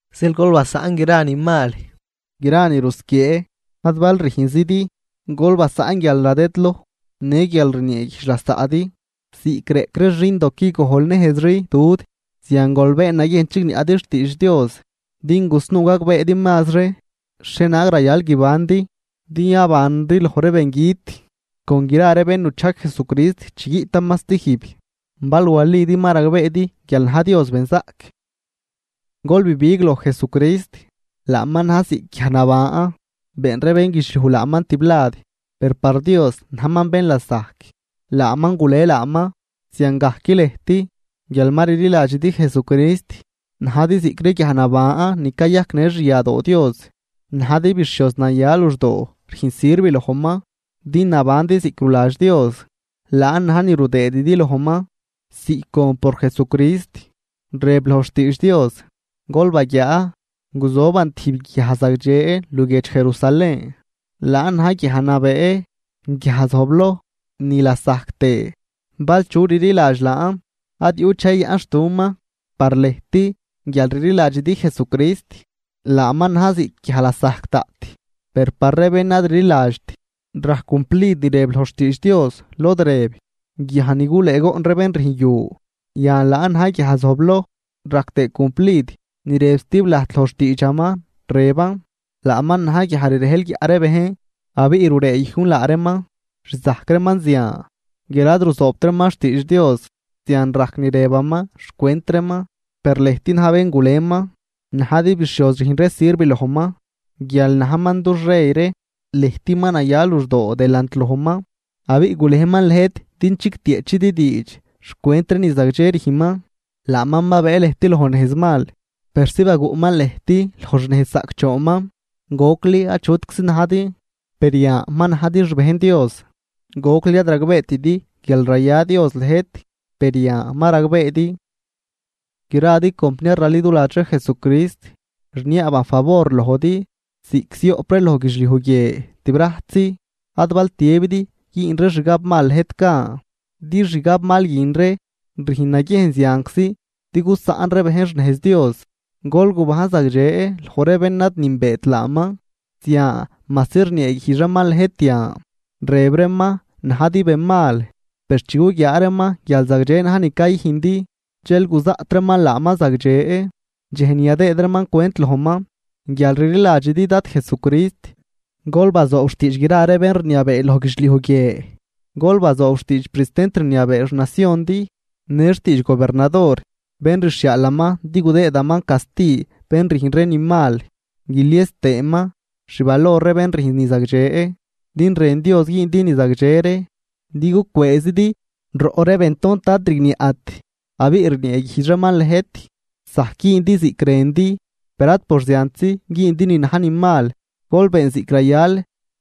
Zeel gol basaꞌn gra ni mal, gra ni rusquiee, ad bal rüjnzidi, gol basaꞌn guialnadëdloj në guial rnieeguijdx lasaꞌdi. Ziꞌc reꞌc ree xindo quigojlnejzri dud, zian gol been naguiejn chigniaꞌdi xtiidx Dios, din gusnuu gagbeedi mazri xhienaag rayal guibandi din yabandi loj ree bengüt con gra ree bén nuchajg Jesucrist chi guiꞌtaman stijb, bal walidi ma ragbeedi guial na̱j Dios benzaꞌc. Gol bibig loj Jesucrist, laaman na̱j ziꞌc guiaj naban. Been ree bénguidxliuj laaman tiblad, per par Dios najman bén lasajc, laaman gule laaman. Ziangajc lëjt, guial ma rliladxidi Jesucrist, najdi ziꞌc ree guiaj naban ni cayajcnë xyadoo Dios. Najdi bixhioz naya luxdoo rüjn sirv lojman, din nabandi ziꞌc ruladx Dios, laan na̱j ni rudëëdi lojman ziꞌc gon por Jesucrist. Rëb loj xtiidx Dios: Gol baguiaa, guzoban tijb guiaj zagdxe luguiedx Jerusalén. Laan na̱j guiaj nabee, guiaj zojbloj, nilasajc tëë. Bal chu chililadx laan, ad yuꞌt dxej yayaꞌnxtuman. Par lëjt, guial rliladxidi Jesucrist, laaman na̱j ziꞌc guiaj lasajc daꞌt. Per par ree bén ad rliladxt rajc cumplid ni rëb loj xtiidx Dios, lod rëb: Guiaj ni gulëëgoꞌn ree bén rüjn yu, yan laan na̱j guiaj zojbloj. Rajc tëë cumplid ni rëb stib lajt loj xtiidxaman, rëban: Laaman na̱j guiaj rirejl guiaꞌ ree bejn, abiꞌ rureeyujn laa reeman. Rzajc reeman zian, guial ad ruzoobt reeman xtiidx Dios, zian rajc ni rëbaman xcwent reeman. Per lëjt na̱j bén guleman, najdi bixhioz rüjn ree sirv lojman, guial najman dux rey ree. Lëjt ma naya luxdoo delant lojman, abiꞌ gulejman lëjt din chigtieꞌchidi diidx xcwent ree ni zagdxe rüjnman. Laaman babëë lëjt loj nejz mal, persi baguꞌman lëjt loj xnejz zaꞌcdxoonman. Gocli achutczi najdi, per yan ma najdi xbejn Dios. Gocli ad ragbeetidi guial raya Dios lëjt, per yan ma ragbeedi. Gradi compniar raliduladx ree Jesucrist, rniaaban favor lojdi, ziꞌc zioꞌp ree loj guidxliuj guie tibrajtzi, ad bal tiëbidi güün ree xgab mal lëjt gan, din xgab mal guin ree rüjn naguiejn zianczi din gusaꞌn ree bejn xnejz Dios. Gol gubajn zagdxe loj ree bén ad nünbeet laaman, zian majsi rnieeguijdx reeman lëjt yan, rëb reeman najdi benmal, per chi guguiaa reeman guial zagdxe na̱j ni cayüjndi, dxel guzaꞌt reeman laaman zagdxe, dxej ni yadëëd reeman cwent lojman. Guial rliladxidi Dad Jesucrist, gol bazoob xtiidx gra ree bén rniabee loj guidxliuj guie. Gol bazoob xtiidx pristent rniabee xnaciondi në xtiidx gobernador bén rxhiaalaman din gudëëdaman casti bén rüjn ree ni mal guilies tëëman xvalor ree bén rüjn ni zagdxe. Din rën Dios güündi ni zagdxe ree din gucwëëzidi roꞌ ree bentont ad rigniaꞌt abiꞌ rnieeguijdx reeman lëjt. Zajc güündi ziꞌc rëndi, per ad por ziantzi güündi ni na̱j ni mal, gol been ziꞌc rayal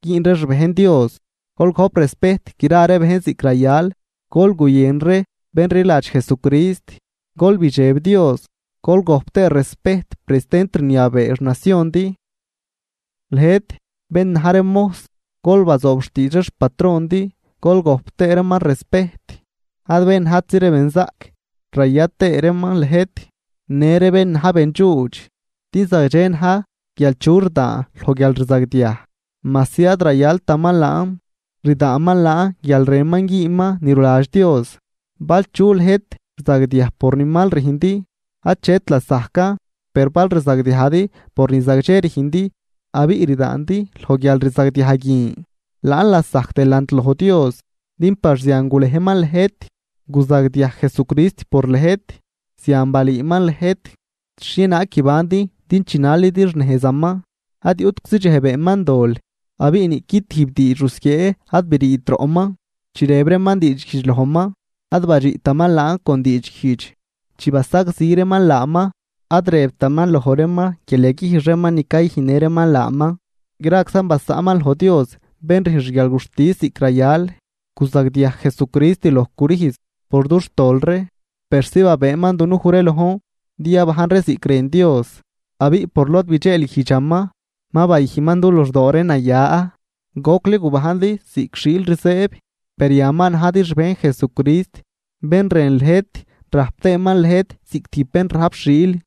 güün ree xbejn Dios. Gol gojp respejt gra bejn ziꞌc rayal, gol guyën ree bén rliladx Jesucrist, gol bidxeb Dios, gol gojp tëë respejt pristent rniabee xnaciondi. Lëjt bén na̱j ree mojs, gol bazoob xtiidx ree xpatrondi, gol gojp tëë reeman respejt, ad bén najtzi ree benzaꞌc raya tëë reeman lëjt, në ree bén na̱j bendxuudx. Din zagdxe na̱j guial chu rdaan loj guialrzagdiaj, majsi ad rayaltaman laan, rdaanman laan guial rënman güünman ni ruladx Dios. Bal chu lëjt rzagdiaj por ni mal rüjndi, achet lasajcan, per bal rzagdiajdi por ni zagdxe rüjndi abiꞌ rdaandi loj guialrzagdiaj guin, laan lasajc delant loj Dios, din par zian gulejman lëjt. Guzagdiaj Jesucrist por lëjt, zian balüüman lëjt xhienaag guibandi din chinalidi xnejzaman. Ad yuꞌtczi dxej beenman dol abiꞌ niꞌqui tijb diidx rusquiee ad briit roꞌman. Chi rëb reeman diidxguijdx lojman, ad badxiꞌtaman laan con diidxguijdx, chi basagzi reeman laaman, ad rëbtaman loj reeman guial yaguijx reeman ni cayüjnnë reeman laaman, graczan basaꞌnman loj Dios bén rüjn xguialguxtis ziꞌc rayal. Guzagdiaj Jesucrist loj crüjz por dux tol ree persi babëëman dunuj ree lojn din yabajn ree ziꞌc rën Dios, abiꞌ por lod bidxeelguijdxaman ma bayüjnman du luxdoo ree naya. Gocli gubajndi ziꞌc xiil rzëëb, per yan ma najdi xbejn Jesucrist bén rën lëjt rajp tëëman lëjt ziꞌc tijb bén rajp xiil.